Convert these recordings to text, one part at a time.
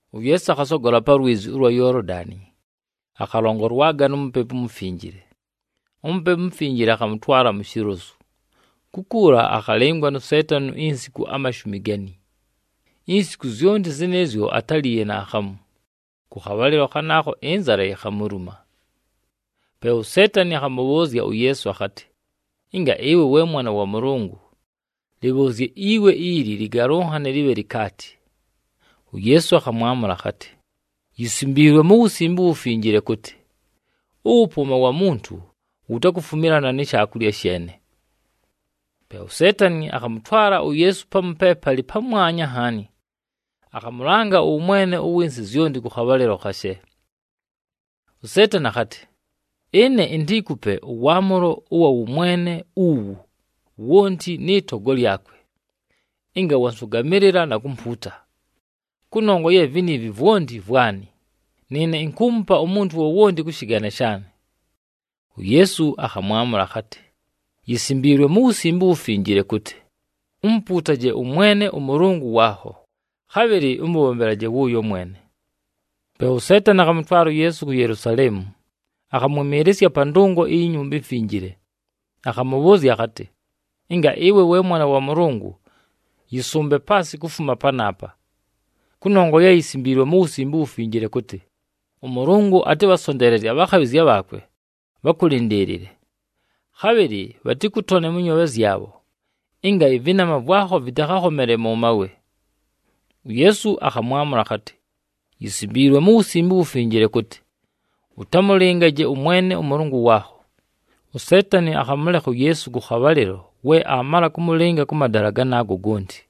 UYeesu akhasogola pa lwizi ʉlwa Yoolodani, akhalongolwaga nu Mupepu uMufinjile. UMupepu uMufinjile akhamʉtwala mu shilozu. Kukuula akhalɨngwa nu Seetani insiku amashumi gani. Insiku zyonti zɨnɨɨzyo atáliiye naakhamu, kʉ khabhalɨlo khanaakho ɨnzala yikhamuluma. Pe uSeetani akhamʉbhʉʉzya uYeesu akhatɨ, “Ɨnga ɨwe we Mwana wa Mʉlʉngʉ, lɨbhʉʉzye iwe ili lɨgalʉnhane lɨbhe likaati.” UYeesu akhamwamʉla akhatɨ, “Yisimbiilwe mu Wusimbe uWufinjile kʉtɨ, ‘Ʉwʉpʉʉma wa muntu wutakufumilana ni shaakulya sheene.’” Pe uSeetani akhamʉtwala uYeesu pamu pe palɨ pamwanya nhaani, akhamʉlanga ʉwʉmwene ʉwɨ nsɨ zyonti kʉ khabhalɨlo khashe. USeetani akhatɨ, “Ɨne intiikupe ʉwaamʉlo ʉwa wʉmwene uwu wonti nɨ togo lyakwe, ɨnga wansʉgamɨlɨla na kumpuuta, kʉnongwa ye viniivi vwonti vwanɨ, nɨɨne inkuumupa umuntu wowonti kʉ shɨgane shaanɨ.” UYeesu akhamwamʉla akhatɨ, “Yisimbiilwe mu Wusimbe uWufinjile kʉtɨ, ‘Umupuutaje ʉMwene ʉMʉlʉngʉ waakho, khabhɨlɨ ʉmʉbhombelaje wʉʉyo mwene.’” Pe uSeetani akhamʉtwala uYeesu ku Yelusaleemu, akhamwɨmɨɨlɨsya pa ndʉngo iyi Nyumba iMfinjile, akhamʉbhʉʉzya akhatɨ, “Ɨnga ɨwe we Mwana wa Mʉlʉngʉ, yɨsʉmbe paasɨ kufuma panaapa. Kʉnongwa ye yisimbiilwe mu Wusimbe uWufinjile kʉtɨ, ‘ɄMʉlʉngʉ atɨbhasonteelezye abhakhabhɨzya bhaakwe, bhakʉlɨndɨɨlɨle,’ khabhɨlɨ, ‘Bhatɨkʉtone mʉ nyoobhe zyabho, ɨnga ɨvɨnama vwakho vɨtakhakhomele mʉ mawe.’” UYeesu akhamwamʉla akhatɨ, “Yisimbiilwe mu Wusimbe uWufinjile kʉtɨ, ‘Ʉtamʉlɨngaje ʉMwene ʉMʉlʉngʉ waakho.’” USeetani akhamʉlekha uYeesu kʉ khabhalɨlo we aamala kʉmʉlɨnga kʉ madala ganaago gonti.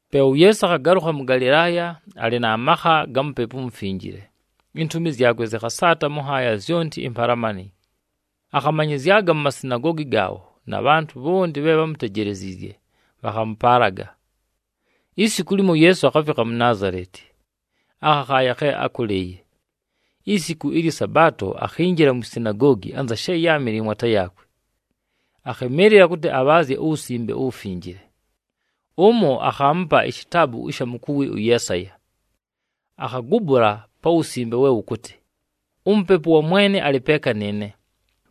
Pe uYeesu akhagalʉkha mʉ Galɨlaaya, alɨ na makha ga Mupepu uMufinjile. Intumi zyakwe zɨkhasaata mʉ nhaaya zyonti impalamani. Akhamanyɨzyaga mu masinagoogi gaabho, na bhantʉ bhonti bhe bhámutejeleziizye bhakhamʉpaalaga. Isiku limo, uYeesu akhafikha mu Naazaleti, akhakhaaya khe ákʉlɨɨye. Isiku ɨlyɨ Sabaato akhinjila mwi sinagoogi anza she yáamɨle mwata yaakwe. Akhɨmɨɨlɨla kʉtɨ abhaazye uWusimbe uWufinjile. Bhakhaamupa ishitaabu ɨsha mukuwi ʉYeesaya, akhagubula pa wusimbe we wʉkʉtɨ, “UMupepu wa Mwene alɨ peeka nɨɨne,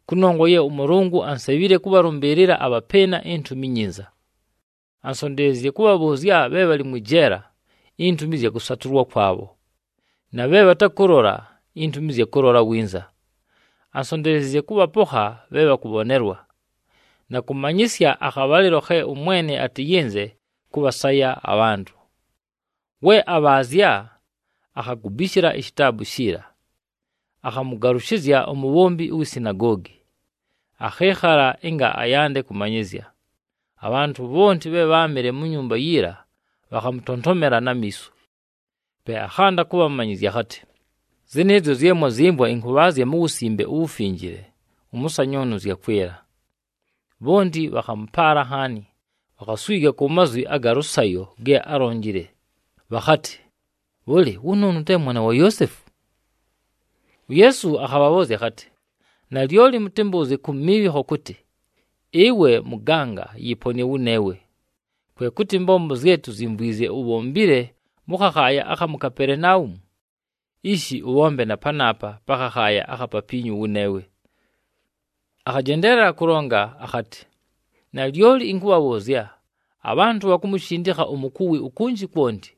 kʉnongwa ye ʉMʉlʉngʉ ansebhile kʉbhalʉmbɨɨlɨla abhapɨɨna iNtumi iNyinza. Ansonteleziizye kʉbhabhʉʉzya bhe bhalɨ mwɨ jeela, intumi ɨzya kʉsatʉlwa kwabho, na bhe bhatakʉlola, intumi ɨzya kʉlola winza. Ansonteleziizye kʉbhapokha bhe bhakʉbhonelwa, na kʉmanyɨsya akhabhalɨlo khe ʉMwene atɨyɨnze kʉbhasaya abhantʉ.” We abhaazya, akhagubishila ishitaabu shiila, akhamʉgalʉshɨzya umubhombi uwi sinagoogi, akhɨɨkhala ɨnga ayande kʉmanyɨzya. Abhantʉ bhonti bhe bháamɨle mu nyumba yiila bhakhamʉtontomela na miiso. Pe akhanda kʉbhamanyɨzya akhatɨ, “Ziniizi zye mwazyɨmvwa ɨnkʉbhaazya mu Wusimbe uWufinjile, ʉmʉsanyʉʉnʉ zyakwɨla.” Bhonti bhakhamʉpaala nhaani, bhakhaswiga ku mazwi aga lʉsayo ge álonjile, bhakhatɨ, “Bhʉlɨ, wʉnʉʉnʉ te mwana wa Yoosefu?” UYeesu akhabhabhʉʉzya akhatɨ, “Nalyoli mʉtɨmbʉʉzye ku miibhikho kʉtɨ, ‘Ɨwe mʉganga, yɨponɨe wʉneewe!’ Kwe kʉtɨ, ɨmbombo zye tuzyimvwizye ubhombile mʉ khakhaaya akha mu Kapelenaumu, ishi ʉbhombe na panaapa pa khakhaaya akha papiinyu wʉneewe.” Akhajendeelela kʉlonga akhatɨ, “Nalyoli ɨnkʉbhabhʉʉzya, abhantʉ bhakumushindikha umukuwi ukunji kwonti,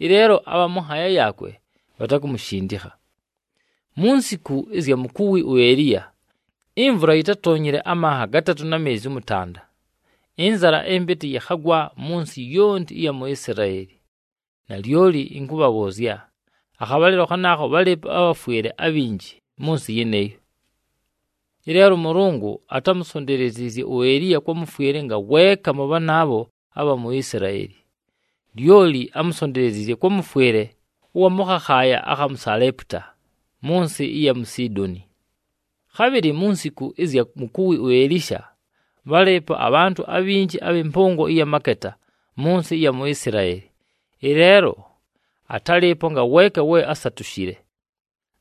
ɨleelo abha mʉ nhaaya yaakwe bhatakumushindikha. Mu nsiku ɨzya mukuwi uEliya, imvula yitátoonyile amanha gatatʉ na meezi ʉmʉtanda, ɨnzala ɨmpɨtɨ yɨkhagwa mʉ nsɨ yonti ɨya mu Isilaeli. Nalyoli ɨnkʉbhabhʉʉzya, akhabhalɨlo khanaakho bhálɨɨpo abhafwɨle abhinji mʉ nsɨ yɨnɨɨyo. Ɨleelo ʉMʉlʉngʉ atámusonteleziizye uEliya kwa mʉfwɨle ngaweeka mʉ bhanaabho abha mu Isilaeli, lyoli ámusonteleziizye kwa mʉfwɨle ʉwa mʉ khakhaaya akha mu Saleeputa, mʉ nsɨ ɨya mu Sidooni. Khabhɨlɨ mu nsiku ɨzya mukuwi uElisha, bhálɨɨpo abhantʉ abhinji abhɨ mpʉngo ɨya maketa mʉ nsɨ ɨya mu Isilaeli. Ɨleelo atálɨɨpo ngaweeka we ásatushile,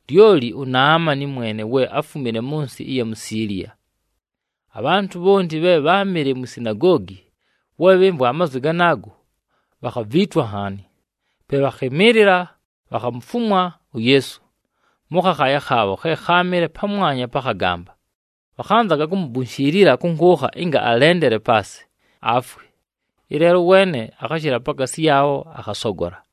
lyoli uNaamani mwene we áfumile mʉ nsɨ ɨya mu Siiliya.” Abhantʉ bhonti bhe bháamɨle mwi sinagoogi, we bhɨmvwa amazwi ganaago, bhakhaviitwa nhaani. Pe bhakhɨmɨɨlɨla, bhakhamufumwa uYeesu mʉ khakhaaya khaabho khe kháamɨle pamwanya pa khagamba. Bhakhanzaga kumubunshiilila kʉ nkʉʉkha ɨnga alendele paasɨ, afwe. Ɨleelo ʉweene akhashɨla pakaasi yaabho, akhasogola.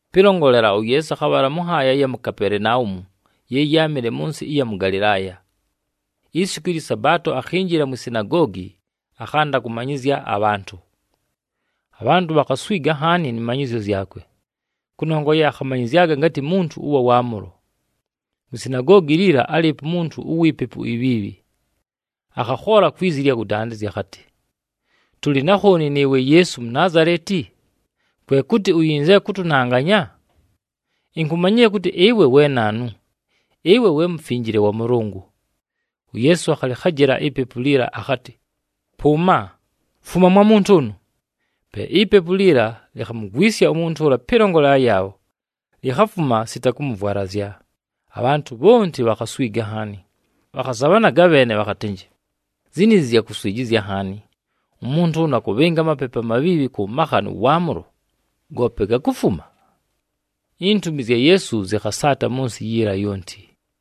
Pɨlongolela, uYeesu akhabhala mʉ nhaaya ɨya mu Kapelenaumu, ye yáamɨle mʉ nsɨ ɨya mʉ Galɨlaaya. Isiku ɨlyɨ Sabaato, akhinjila mwi sinagoogi, akhanda kʉmanyɨzya abhantʉ. Abhantʉ bhakhaswiga nhaani nɨ manyɨzyo zyakwe, kʉnongwa ye akhamanyɨzyaga ngatɨ muntu ʉwa waamʉlo. Mwi sinagoogi liila, álɨɨpo umuntu uwi pepu ibhiibhi. Akhakhoola kwi zi ɨlya kʉdandɨzya akhatɨ, “Tʉlɨ na khooni nɨɨwe Yeesu Munaazaleti? Kwe kʉtɨ uyinzile kʉtʉnanganya? Inkumanyile kʉtɨ ɨwe we naanu, ɨwe we Mufinjile wa Mʉlʉngʉ!” UYeesu akhalɨkhajɨla ipepu liila akhatɨ, “Pʉʉma! Fuma mwa muntu ʉnʉ!” Pe ipepu liila likhamugwisya umuntu ʉla pɨlongolela yaabho, likhafuma sita kʉmʉvwalazya. Abhantʉ bhonti bhakhaswiga nhaani, bhakhazabhanaga bheene bhakhatɨnjɨ, “Ziniizi zya kuswijizya nhaani! Umuntu ʉnʉ akʉbhɨnga amapepu amabhiibhi kʉ makha nʉ waamʉlo, goope gakufuma!” Intumi zya Yeesu zɨkhasaata mʉ nsɨ yiila yonti.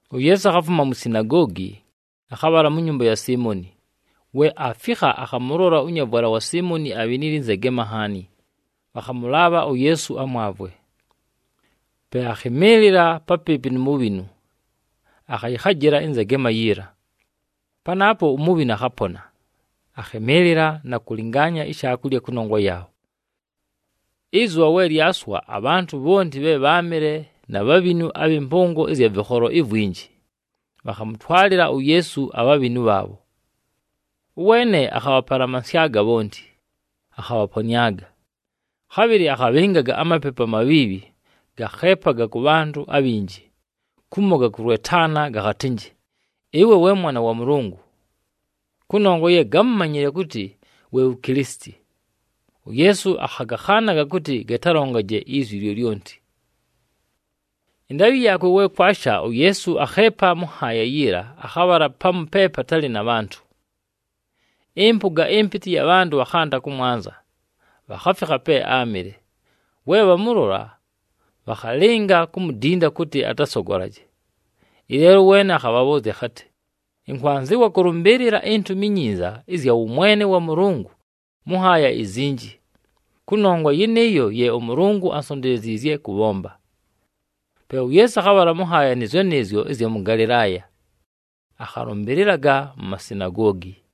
UYeesu akhafuma mwi sinagoogi, akhabhala mu nyumba ya Siimoni. We aafikha, akhamʉlola ʉnyavwala wa Siimoni abhinile ɨnzegema nhaani, bhakhamʉlaabha uYeesu amwavwe. Pe akhɨmɨɨlɨla papɨɨpɨ nu mubhinu, akhayɨkhajɨla ɨnzegema yiila. Panaapo umubhinu akhapona, akhɨmɨɨlɨla na kʉlɨngaanya ishaakulya kʉnongwa yaabho. Ɨzʉbha we lyaswa, abhantʉ bhonti bhe bháamɨle na bhabhinu abhɨ mpʉngo ɨzya vɨkholo ivwinji, bhakhamʉtwalɨla uYeesu abhabhinu bhaabho. Ʉweene akhabhapalamansyaga bhonti, akhabhaponɨaga. Khabhɨlɨ akhabhɨngaga amapepu amabhiibhi, gakheepaga kʉ bhantʉ abhinji, kumo gakʉlwetaana gakhatɨnjɨ, “Ɨwe we Mwana wa Mʉlʉngʉ!” Kʉnongwa ye gámumanyile kʉtɨ we wu Kilisiti, uYeesu akhagakhaanaga kʉtɨ gatalongaje izwi lyolyonti. Ɨndaabhɨ yaakwe we kwasha, uYeesu akheepa mʉ nhaaya yiila akhabhala pamu pe patalɨ na bhantʉ. Ɨmpʉga ɨmpɨtɨ ɨya bhantʉ bhakhanda kʉmwanza, bhakhafikha pe áamɨle. We bhamʉlola, bhakhalɨnga kumudinda kʉtɨ atasogolaje. Ɨleelo ʉweene akhabhabhʉʉzya akhatɨ, “Ɨnkwanzɨwa kʉlʉmbɨɨlɨla iNtumi iNyinza ɨzya wʉmwene wa Mʉlʉngʉ mʉ nhaaya izinji, kʉnongwa yɨnɨɨyo ye ʉMʉlʉngʉ ansonteleziizye kʉbhomba.” Pe uYeesu akhabhala mʉ nhaaya nɨɨzyo nɨɨzyo ɨzya mʉ Galɨlaaya, akhalʉmbɨlɨlaga mu masinagoogi.